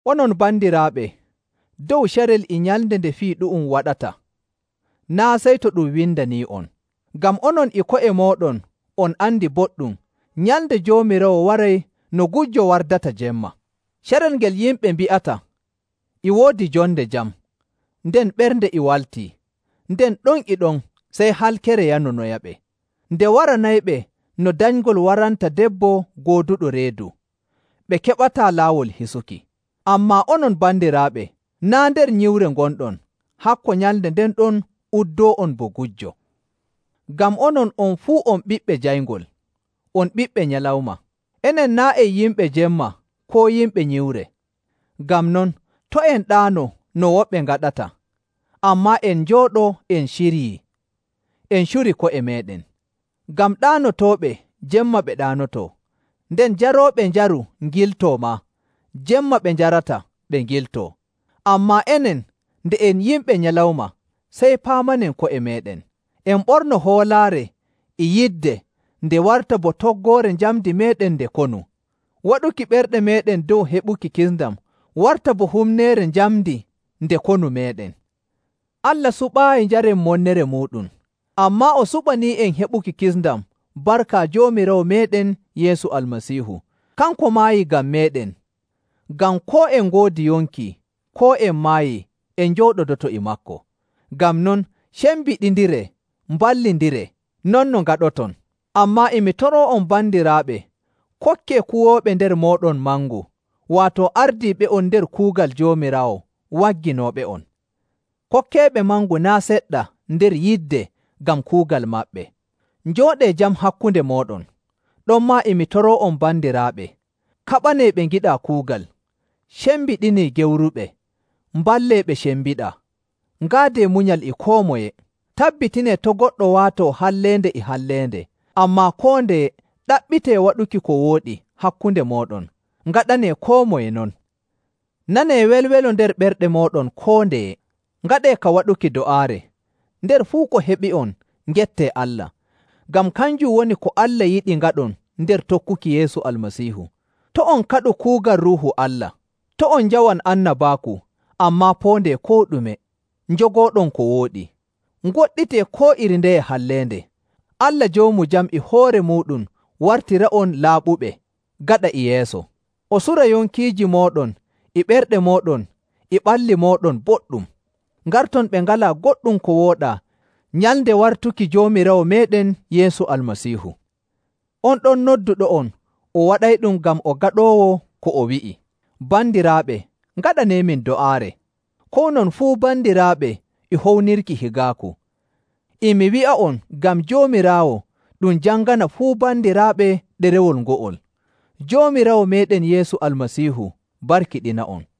Onon bandiraaɓe, dow carel e nyalnde nde fuu fii ɗu'um waɗata, naa' sey to ɗum windanii'on. Ngam onon e ko'e mooɗon on andi boɗɗum Nyalnde Joomiraawo waray no gujjo wardata jemma. Carel ngel yimɓe mbi'ata, “E woodi jonde jam, nden ɓernde e waltii,” nden ɗon e ɗon sey halkere yanonoyaɓe. Nde waranayɓe no danyngol waranta debbo gooduɗo reedu, ɓe keɓataa laawol hisuki. Ammaa onon bandiraaɓe, naa' nder nyiwre ngonɗon, hakko nyalnde nden ɗon uddoo'on bo gujjo. Ngam onon on fuu on ɓiɓɓe jayngol, on ɓiɓɓe nyalawma. Enen naa' en yimɓe jemma koo yimɓe nyiwre. Ngam non, to' en ɗaano no woɓɓe ngaɗata, ammaa en njooɗo en ciryii, en curi ko'e meeɗen. Ngam ɗaanotooɓe, jemma ɓe ɗaanotoo, nden jarooɓe njaru ngiltoo maa, jemma ɓe njarata ɓe ngiltoo. Ammaa enen, nde en yimɓe nyalawma, sey paamanen ko'e meeɗen. En ɓorno hoolaare e yidde nde warta bo toggoore njamndi meeɗen nde konu, waɗuki ɓerɗe meeɗen dow heɓuki kisndam warta bo humneere njamndi nde konu meeɗen. Allah suɓaayi njaren monnere muuɗum, ammaa o suɓanii'en heɓuki kisndam barka Joomiraawo meeɗen Yeesu Almasiihu. Kanko maayi ngam meeɗen, ngam koo en ngoodi yonki koo en maayii, en njooɗodoto e maako. Ngam non, cembiɗindiree mballindiree non no ngaɗoton. Ammaa e mi toroo'on bandiraaɓe, kokkee kuwooɓe nder mooɗon mangu, waato ardiiɓe'on nder kuugal Joomiraawo wagginooɓe'on. Kokkeeɓe mangu naa' seɗɗa nder yidde ngam kuugal maɓɓe. Njooɗee jam hakkunde mooɗon. Ɗonmaa e min toroo'on bandiraaɓe, kaɓanee ɓe ngiɗaa kuugal, cembiɗinee gewruɓe, mballee ɓe cembiɗaa, ngaadee munyal e koo moye. Tabbitinee to' goɗɗo waato halleende e halleende. Ammaa koo ndeye ɗaɓɓitee waɗuki ko wooɗi hakkunde mooɗon. Ngaɗanee koo moye non. Nanee welwelo nder ɓerɗe mooɗon koo ndeye. Ngaɗee ka waɗuki do'aare. Nder fuu ko heɓi'on ngettee Allah, ngam kanjum woni ko Allah yiɗi ngaɗon nder tokkuki Yeesu Almasiihu. To' on kaɗu kuugal Ruuhu Allah. To' on njawan annabaaku, ammaa poondee koo ɗume, njogooɗon ko wooɗi. Ngoɗɗitee koo iri ndeye halleende. Allah Joomu Jam e hoore muuɗum wartira'on laaɓuɓe gaɗa e yeeso. O sura yonkiiji mooɗon e ɓerɗe mooɗon e ɓalli mooɗon boɗɗum, ngarton ɓe ngalaa goɗɗum ko wooɗaa nyalnde wartuki Joomiraawo meeɗen Yeesu Almasiihu. On ɗon nodduɗo'on, o waɗayɗum ngam o gaɗoowo ko o wi'i. Bandiraaɓe, ngaɗaneemin do'aare. Kownon fuu bandiraaɓe e hownirki higaaku. E mi wi'a'on ngam Joomiraawo ɗum jangana fuu bandiraaɓe ɗerewol ngo'ol. Joomiraawo meeɗen Yeesu Almasiihu barkiɗina'on.